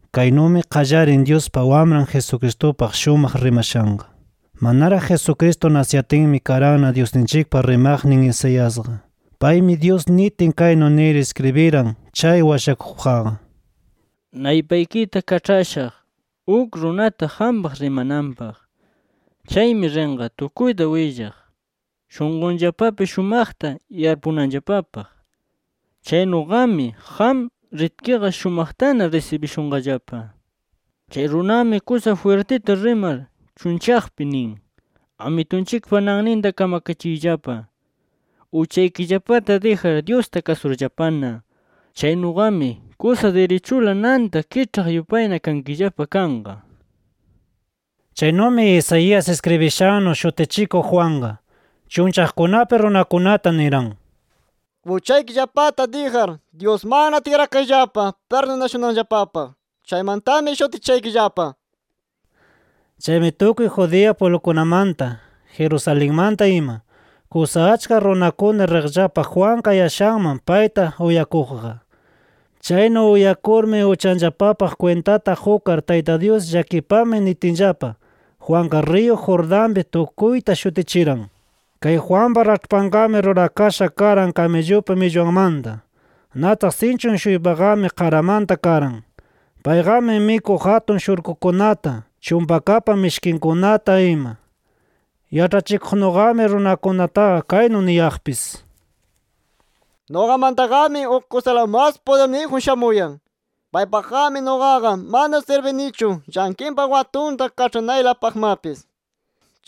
Kaynumi qallarin Dyuspa Wamran Jesucristupaq shumaq rimashanqa. Manaraq Jesucristo nasiyatinmi karanna Dyusninchikpa rimaqnin Isaiasqa. Paymi Dyus nitin kaynu nir iskribiran chay washakuqpaqqa: “Naypaykita kaĉhashaq uk runata qampaq rimananpaq. Chaymi rinqa tukuyta willaq shunqunllapapi shumaqta yarpunanllapapaq. Chaynuqami qam ritkiqa shumaqtana risibishunqallapa. Chay runami kusa jwirtita rimar chunllaqpi nin: ‘Amitunchikpa nanninta kamakachiyllapa, uchaykillapata dijar Dyusta kasurllapana. Chaynuqami kusa dirichula nanta kiĉhaq yupayna kankillapa kanqa’ nir”. Chaynumi Isaías iskribishannu Shutichikuq Juanqa, chunllaqkunapi runakunata niran: “Uchaykillapata dijar Dyusmanna tikrakayllapa pirdunashunanllapapaq. Chaymantami shutichishaykillapa” nir. Chaymi tukuy Judea pwiblukunamanta, Jerusalenmanta ima, kusa achka runakuna riqllapa Juan kayashanman payta uyakuqqa. Chaynu uyakurmi uchanllapapaq kwintata qukar Tayta Dyus llakipamay nitinllapa, Juanqa riyu Jordanpi tukuyta shutichiran. Kay Juanpa raĉhpanqami rurakasha karan kamillupa millwanmanta. Nataq sinchun-shuypaqami qaramanta karan. Payqami mikuq atun shurkukunata, chumpakapa mishkinkunata ima. Yaĉhachikuqnuqami runakunataqa kaynu niyaqpis: “Nuqamantaqami uk kusala mas pudirniyjun shamuyan. Paypaqqami nuqaqa mana sirbinichu llanqinpa watunta kaĉhanaylapaqmapis.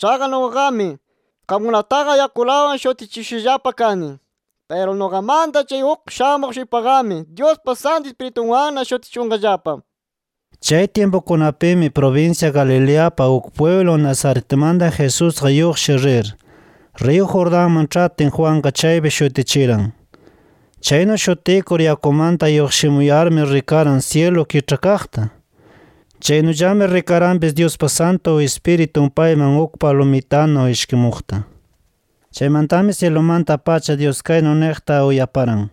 Chaqa nuqaqami qamkunataqa yakulawan shutichishushallapa kani. Piru nuqamanta chay uk shamuq-shuypaqami Dyuspa Santu Ispiritunwanna shutichishunqallapa”. Chay tyimpukunapimi prubinsya Galileapa uk pwiblun Nazaretmanta Jesusqa lluqshir rir, riyu Jordanman ĉhatin Juanqa chaypi shutichiran. Chaynu shutikur yakumanta lluqshimuyarmi rikaran syilu kiĉhakaqta. Chaynullami rikaranpis Dyuspa Santu Ispiritun payman uk palumitanu ishkimuqta. Chaymantami syilumanta-pacha Dyus kaynu niqta uyaparan: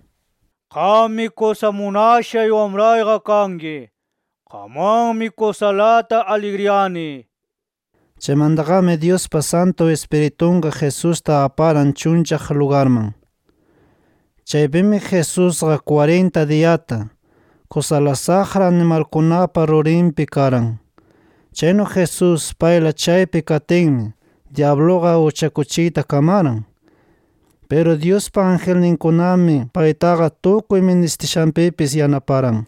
“Qammi kusa munashay Wamrayqa kanki. Qamwanmi kusalata aligriyani” nir. Chaymantaqami Dyuspa Santu Ispiritunqa Jesusta aparan chunllaq lugarman. Chaypimi Jesusqa kwarinta diyata, kusala saqra animalkunapa rurinpi karan. Chaynu Jesús payla chaypi katinmi dyabluqa uchakuchiyta kamaran. Piru Dyuspa angelninkunami paytaqa tukuy ministishanpipis yanaparan.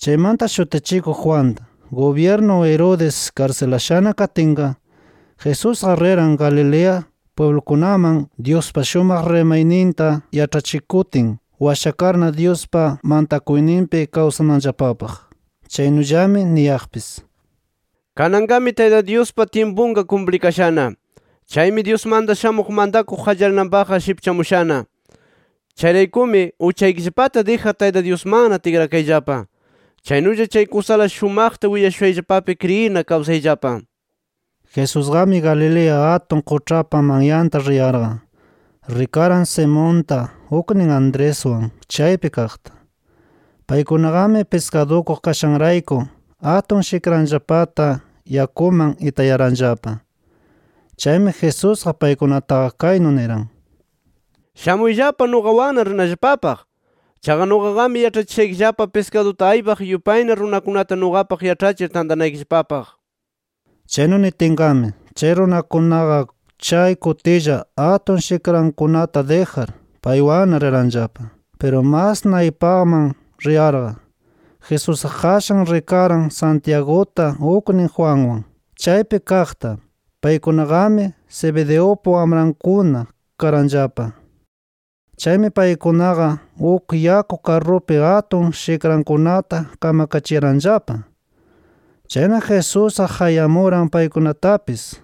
Chaymanta Shutichikuq Juanta, gubyirnu Herodes karsilashana katinqa, Jesusqa riran Galilea pwiblukunaman Dyuspa shumaq rimayninta yaĉhachikutin, washakarna Dyuspa mantakuyninpi kawsananllapapaq. Chaynullami niyaqpis: “Kananqami Tayta Dyuspa tyimpunqa kumplikashana. Chaymi Dyusmanta shamuq mantakuq qallarinanpaqqa shipchamushana. Chayraykumi uchaykillapata dijar Tayta Dyusmanna tikrakayllapa. Chaynulla chay kusala shumaqta willashushayllapapi kriyirna kawsayllapa”. Jesusqami Galilea atun quĉhapa manyanta riyarqa, rikaran Simonta uknin Andreswan chaypi kaqta. Paykunaqami piskadukuq kashanrayku atun shikranllapata yakuman itayaranllapa. Chaymi Jesusqa paykunataqa kaynu niran: —Shamuyllapa nuqawanna rinallapapaq. Chaqa nuqaqami yaĉhachishaykillapa piskaduta aypaq yupayna runakunata nuqapaq yaĉhachir tantanaykillapapaq nir. Chaynu nitinqami, chay runakunaqa chay kutilla atun shikrankunata dijar, paywanna riranllapa. Piru mas naypaqman riyarqa, Jesusqa qashan rikaran Santiaguta uknin Juanwan chaypi kaqta. Paykunaqami Zebedeupa wamrankuna karanllapa. Chaymi paykunaqa uk yaku karrupi atun shikrankunata kamakachiyaranllapa. Chayna Jesusqa qayamuran paykunatapis.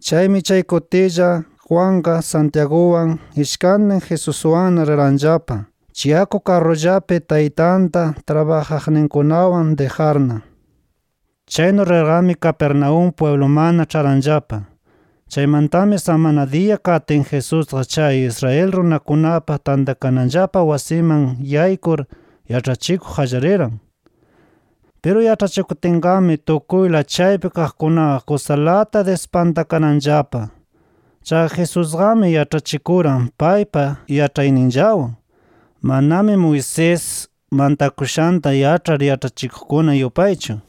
Chaymi chay kutilla, Juanqa Santiaguwan ishkantin Jesuswanna riranllapa, chay yaku karrullapi taytanta trabajaqninkunawan dijarna. Chaynu rirqami Capernaúm pwiblumanna ĉharanllapa. Chaymantami samana diya katin Jesusqa chay Israel runakunapa tantakananllapa wasiman yaykur yaĉhachikuq qallariran. Piru yaĉhachikutinqami tukuyla chaypi kaqkunaqa kusalata dispantakaranllapa. Chaqa Jesusqami yaĉhachikuran paypa yaĉhayninllawan, manami Moisés mantakushanta yaĉhar yaĉhachikuqkuna yupaychu.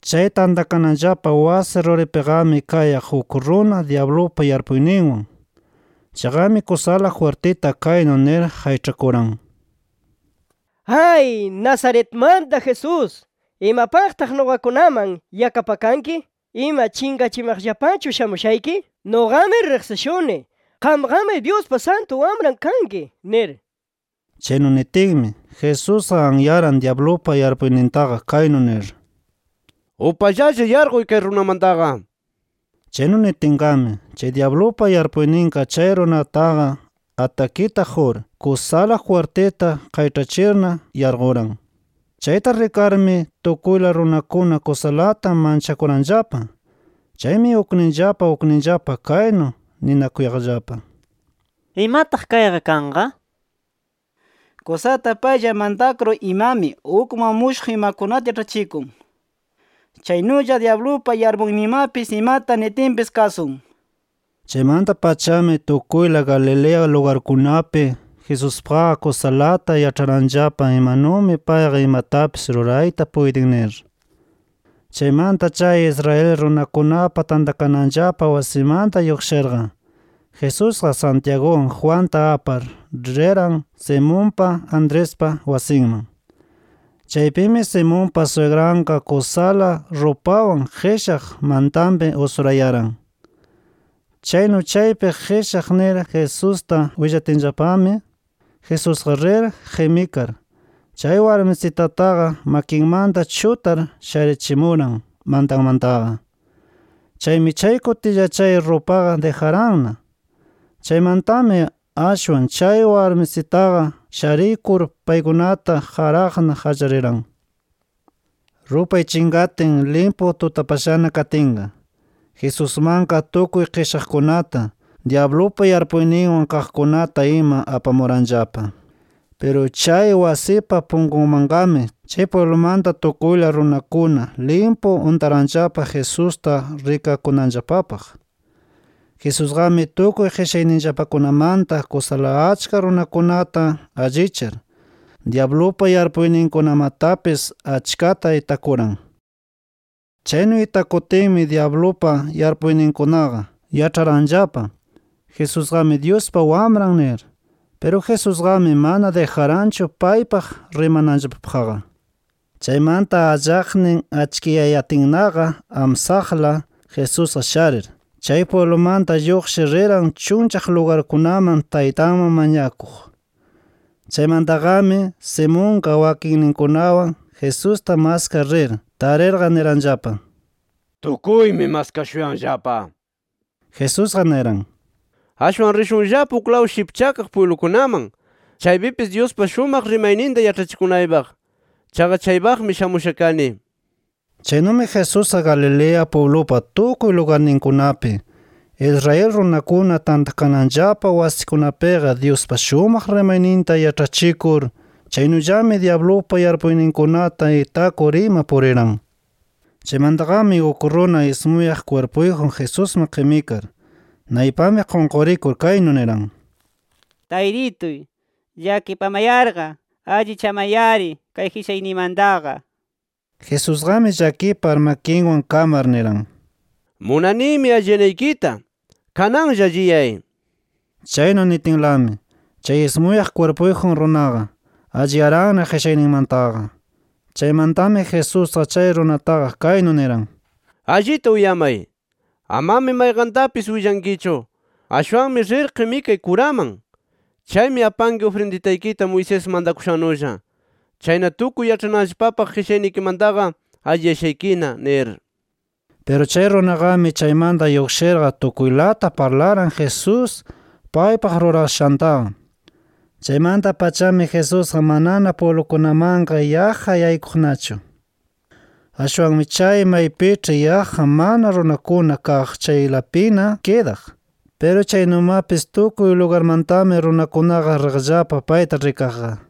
Chay tantakananllapa wasi ruripiqami kayaq uk runa dyablupa yarpuyninwan. Chayqami kusala jwirtita kaynu nir qayĉhakuran: —¡Ay! Nazaretmanta Jesús, ¿imapaqtaq nuqakunaman yakapakanki? ¿Ima, chinqachimaqllapachu shamushayki? ¡Nuqami riqsishuni! ¡Qamqami Dyuspa Santu Wamran kanki! nir. Chaynu nitinmi, Jesusqa anyaran dyablupa yarpuynintaqa kaynu nir: —¡Upallalla yarquy kay runamantaqa! nir. Chaynu nitinqami, chay dyablupa yarpuyninqa chay runataqa atakita qur, kusala jwirtita qayĉhachirna yarquran. Chayta rikarmi, tukuyla runakuna kusalata manchakuranllapa. Chaymi ukninllapa ukninllapa kaynu ninakuyaqllapa: “¿Imataq kayqa kanqa? ¡Kusata paylla mantakur imami ukman mushuq imakunata yaĉhachikun! ¡Chaynulla dyablupa yarpuyninmapis imata nitinpis kasun!” nir. Chaymanta-pachami tukuyla Galilea lugarkunapi Jesuspaqqa kusalata yaĉharanllapa imanumi payqa imatapis rurayta puytin nir. Chaymanta chay Israel runakunapa tantakananllapa wasimanta lluqshirqa, Jesusqa Santiaguwan, Juanta apar riran Simonpa, Andrespa wasinman. Chaypimi Simonpa swigranqa kusala rupawan qishaq mantanpi usurayaran. Chaynu chaypi qishaq nir Jesusta willatinllapami, Jesusqa rir qimikar, chay warmisitataqa makinmanta chutar sharichimuran mantanmantaqa. Chaymi chay kutilla chay rupaqa dijaranna. Chaymantami ashwan chay warmisitaqa sharikur paykunata qaraqna qallariran. Rupay chinqatin limpu tutapashana katinqa, Jesusmanqa tukuy qishaqkunata, dyablupa yarpuyninwan kaqkunata ima apamuranllapa. Piru chay wasipa punkunmanqami chay pwiblumanta tukuyla runakuna limpu untaranllapa Jesusta rikakunanllapapaq. Jesusqami tukuy qishayninllapakunamanta kusala achka runakunata allichar, dyablupa yarpuyninkunamatapis achkata itakuran. Chaynu itakutinmi dyablupa yarpuyninkunaqa, yaĉharanllapa “Jesusqami Dyuspa Wamran” nir. Piru Jesusqami mana dijaranchu paypaq rimananllapapaqqa. Chaymanta allaqnin achkiyayatinnaqa amsaqla Jesusqa sharir, chay pwiblumanta lluqshir riran chunllaq lugarkunaman Taytanman mañakuq. Chaymantaqami, Simonqa wakinninkunawan Jesusta maskaq rir, tarirqa niranllapa: —Tukuymi maskashuyanllapa nir. Jesusqa niran: —Ashwan rishunllapa uklaw shipchakaq pwiblukunaman, chaypipis Dyuspa shumaq rimayninta yaĉhachikunaypaq. Chaqa chaypaqmi shamusha kani. Chaynumi Jesusqa Galilea pwiblupa tukuy lugarninkunapi, Israel runakuna tantakananllapa wasikunapiqa Dyuspa shumaq rimayninta yaĉhachikur chaynullami dyablupa yarpuyninkunata itakur ima puriran. Chaymantaqami uk runa ismuyaq kwirpuyjun Jesusman qimikar, naypanpi qunqurikur kaynu niran: —¡Taytituy! llakipamayarqa allichamay-ari kay qishayniymantaqa nir. Jesusqami llakipar makinwan kamar niran: —Munanimi alliyanaykita. Kananlla alliyay, nir. Chaynu nitinlami, chay ismuyaq kwirpuyjun runaqa, alliyaranna qishayninmantaqa. Chaymantami Jesusqa chay runataqa kaynu niran: —¡Allita uyamay! Amami mayqantapis willankichu. Ashwanmi rir qimikay kuraman. Chaymi apanki ufrinditaykita Moisés mantakushannulla. Chayna tukuy yaĉhananllapapaq qishaynikimantaqa alliyashaykina nir. Piru chay runaqami chaymanta lluqshirqa tukuylata parlaran Jesús, paypaq rurashantaqa. Chaymanta-pachami Jesusqa manana pwiblukunamanqa yaqqa yaykuqnachu. Ashwanmi chay maypiĉhi yaqqa mana runakuna kaq chaylapina kidaq. Piru chaynumapis tukuy lugarmantami runakunaqa riqllapa payta rikaqqa.